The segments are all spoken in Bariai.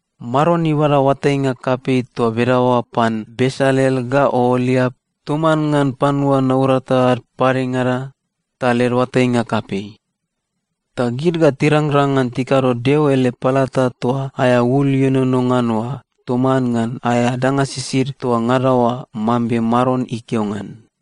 “Maron ibada oatainga kapei toa bedaoa pan Besalel ga Ooliap toman ngan panua naurata ad padengada, ta led oatainga kapei. Ta gid ga tirangrang ngan tikado Deo ele palata toa aea ul ienono ngan oa toman ngan aea danga sisid toa ngada oa, mambe Maron ikeo ngan.”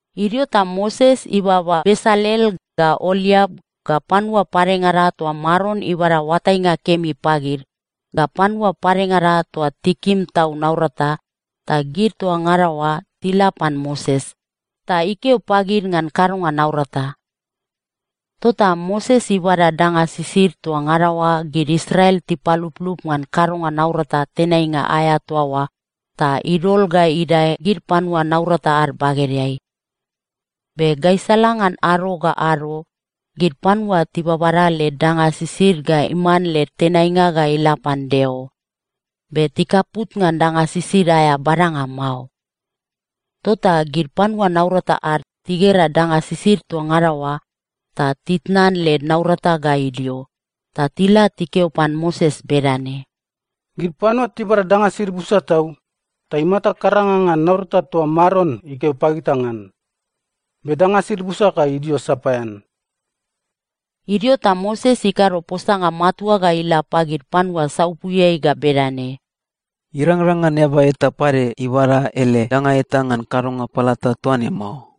Idio ta Moses ibaba Besalel, ga Ooliap, ga panua padengada toa Maron ibada oatainga kemi pagid, ga panua padengada toa tikim tau naurata, ta gid toa ngada oa tila pan Moses, ta ikeo pagid ngan kadonga naurata. Tota Moses ibada danga sisid toa ngada oa gid Israel tipaluplup ngan kadonga naurata tenainga aea toa oa, ta idol ga idae gid panua naurata ad bagedeai. Be gaisala ngan ado ga ado, gid panua tibabada led danga sisid ga iman led tenainga ga ila pan Deo. Be tikaput ngan danga sisid aea badanga mao. Tota gid panua naurata ad tigera danga sisid toa ngada oa, ta titnan led naurata ga idio, ta tila tikeo pan Moses bedane, “Gid panua tibada danga sisid busa tau, ta imata karanga ngan naurata toa Maron ikeo pagita ngan. Be danga sisid busa ga idio sapaean.” Idio ta Moses ikado posanga matua ga ila pagid panua saupuiai ga bedane, “Irangrang ngan eaba eta pade ibada ele danga eta ngan kadonga palata toa ne mao.”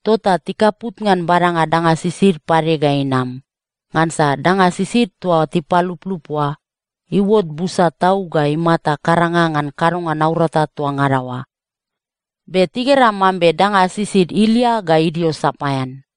Tota tikaput ngan badanga danga sisid pade ga inam, ngansa danga sisid toa tipaluplup oa, iuot busa tau ga imata karanga ngan kadonga naurata toa ngada oa. Be tigera mambe danga sisid ilia ga idio sapaean.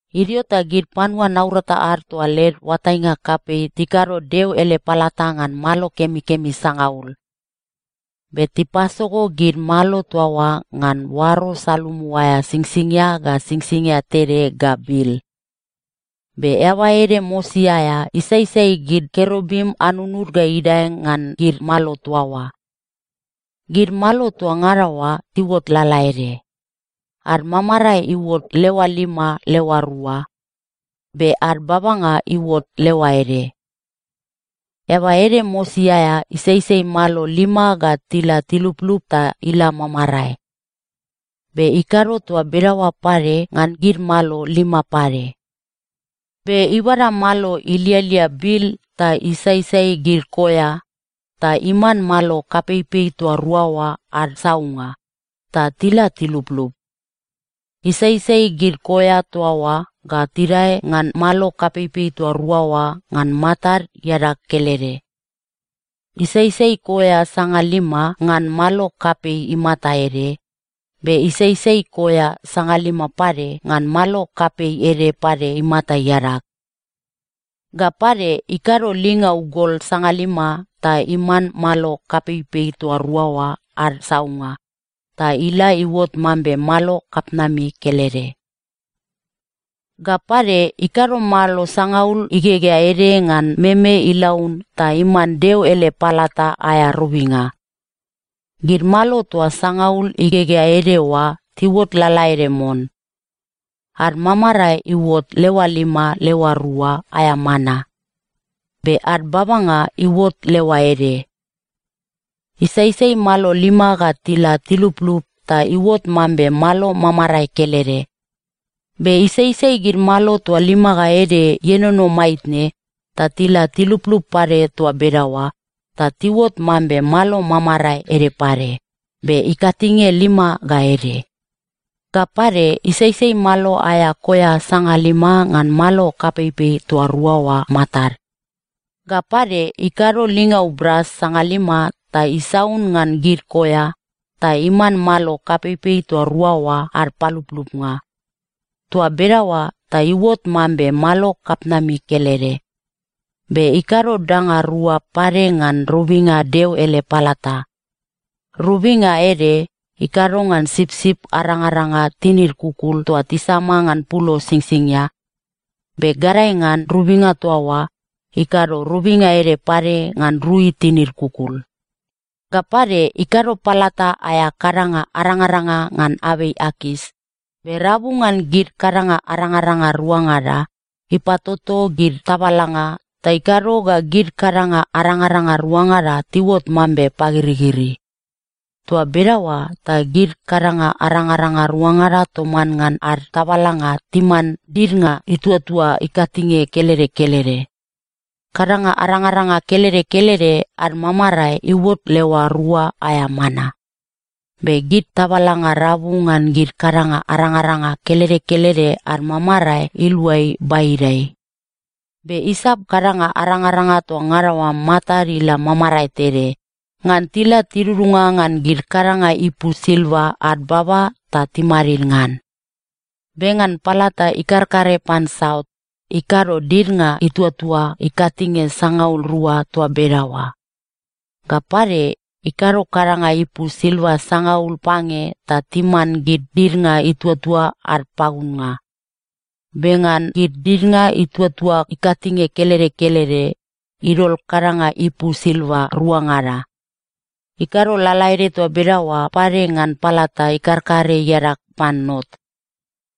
Idio ta gid panua naurata ad toa led oatainga kapei tikado Deo ele palata ngan malo kemikemi sangaul. Be tipasogo gid malo toa oa ngan oaro salumu aea singsingia ga singsingia tede ga bil. Be eaba ede mosi aea isaisai gid kerubim anunud ga idae ngan gid malo toa oa. Gid malo toa ngada oa tiuot lalaede. Ad mamarae iuot leoa lima leoa rua. Be ad babanga iuot leoa ede. Eaba ede mosi aea isaisai malo lima ga tila tiluplup ta ila mamarae. Be ikado toa bedaoa pade ngan gid malo lima pade. Be ibada malo ilialia bil ta isaisai gid koea, ta iman malo kapeipei toa rua oa ad saunnga, ta tila tiluplup. Isaisai gid koea toa oa ga tidae ngan malo kapeipei toa rua oa ngan matad iadag kelede. Isaisai koea sangalima ngan malo kapei imata ede, be isaisai koea sangalima pade ngan malo kapei ede pade imata iadag. Ga pade, ikado lingau gol sangalima ta iman malo kapeipei toa rua oa ad saunnga, ta ila iuot mambe malo kapitnami kelede. Ga pade, ikado malo sangaul igegea ede ngan meme ilaun ta iman Deo ele palata aea robinga. Gid malo toa sangaul igegea ede oa tiuot lalaede mon. Ad mamarae iuot leoa lima leoa rua aea mana. Be ad babanga iuot leoa ede. Isaisai malo lima ga tila tiluplup ta iuot mambe malo mamarae kelede. Be isaisai gid malo toa lima ga ede ienono maitne, ta tila tiluplup pade toa bedaoa, ta tiuot mambe malo mamarae ede pade, be ikatinge lima ga ede. Ga pade, isaisai malo aea koea sangalima ngan malo kapeipei toa rua oa matad. Ga pade, ikado lingau bras sangalima ta isaun ngan gid koea, ta iman malo kapeipei toa rua oa ad paluplupnga. Toa bedaoa ta iuot mambe malo kapitnami kelede. Be ikado danga rua pade ngan robinga Deo ele palata. Robinga ede, ikado ngan sipsip arangaranga tinid kukul toa tisama ngan pulo singsingia. Be gadae ngan robinga toa oa, ikado robinga ede pade ngan rui tinid kukul. Ga pade, ikado palata aea kadanga arangaranga ngan abei akas, be rabu ngan gid kadanga arangaranga ruangada, ipatoto gid tabalanga, ta ikado ga gid kadanga arangaranga ruangada tiuot mambe pagirigiri. Toa bedaoa ta gid kadanga arangaranga ruangada toman ngan ad tabalanga timan didnga ituatua ikatinge kelede kelede. Kadanga arangaranga kelede kelede ad mamarae iuot leoa rua aea mana. Be gid tabalanga rabu ngan gid kadanga arangaranga kelede kelede ad mamarae iluai baidai. Be isap kadanga arangaranga toa ngada oa matad ila mamarae tede, ngan tila tidudunga ngan gid kadanga ipu silva ad baba ta timadid ngan. Be ngan palata ikarkare pan saut, ikado didnga ituatua ikatinge sangaul rua toa bedaoa. Ga pade, ikado kadanga ipu silva sangaul pange ta timan gid didnga ituatua ad pagunnga. Be ngan gid didnga ituatua ikatinge kelede kelede, idol kadanga ipu silva ruangada. Ikado lalaede toa bedaoa pade ngan palata ikarkare iadag pan not.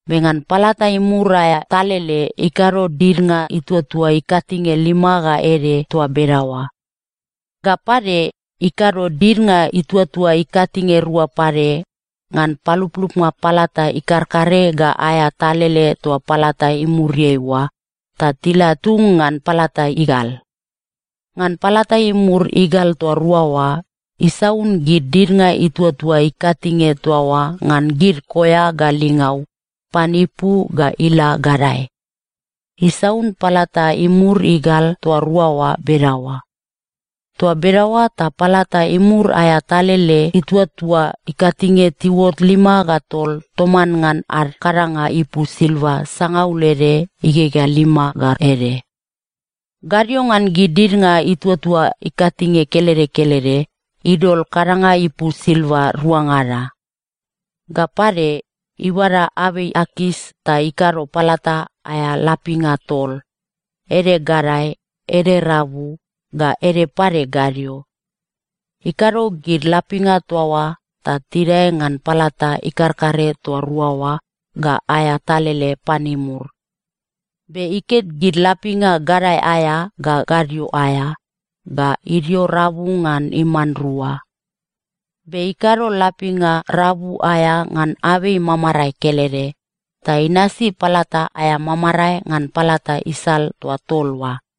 Be ngan palata imur aea talele, ikado didnga ituatua ikatinge lima ga ede toa bedaoa. Ga pade, ikado didnga ituatua ikatinge rua pade, ngan paluplupnga palata ikarkare ga aea talele toa palata imuriai oa, ta tila tung ngan palata igal. Ngan palata imur igal toa rua oa, isaun gid didnga ituatua ikatinge toa oa ngan gid koea ga lingau, pan ipu ga ila gadae. Isaun palata imur igal toa rua oa bedaoa. Toa bedaoa ta palata imur aea talele ituatua ikatinge tiuot lima ga tol toman ngan ad kadanga ipu silva sangaul ede igegea lima ga ede. Gadio ngan gid didnga ituatua ikatinge kelede kelede, idol kadanga ipu silva ruangada. Ga pade, ibada abei akas ta ikado palata aea lapinga tol, ede gadae, ede rabu, ga ede pade gadio. Ikado gid lapinga toa oa ta tidae ngan palata ikarkare toa rua oa ga aea talele pan imur. Be iket gid lapinga gadae aea ga gadio aea, ga idio rabu ga iman rua. Be ikado lapinga rabu aea ngan abei mamarae kelede, ta inasi palata aea mamarae ngan palata isal toa tol oa.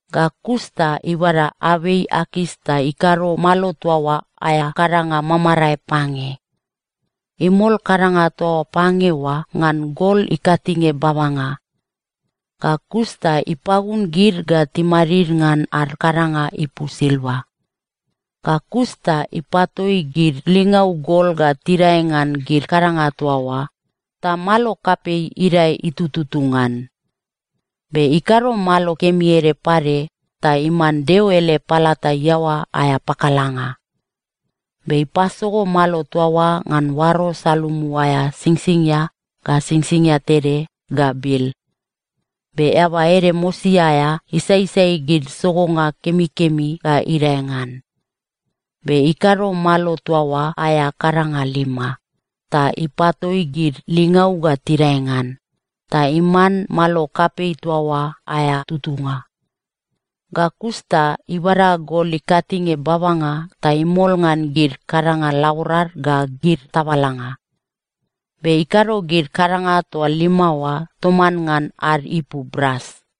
Ga kus ta ibada abei akas ta ikado malo toa oa aea kadanga mamarae pange. Imol kadanga toa pange oa ngan gol ikatinge babanga, ga kus ta ipagun gid ga timadid ngan ad kadanga ipu silva. Ga kus ta ipatoi gid lingau gol ga tidae ngan gid kadanga toa oa, ta malo kapei idae itututu ngan. Be ikado malo kemi ede pade ta iman Deo ele palata iaoa aea pakalanga. Be ipasogo malo toa oa ngan oaro salumu aea singsingia ga singsingia tede ga bil. Be eaba ede mosi aea isaisai gid sogonga kemikemi ga idae ngan. Be ikado malo toa oa aea kadanga lima, ta ipatoi gid lingau ga tidae ngan, ta iman malo kapei toa oa aea tutunga. Ga kus ta ibada gol ikatinge babanga ta imol ngan gid kadanga laborad ga gid tabalanga. Be ikado gid kadanga toa lima oa toman ngan ad ipu bras.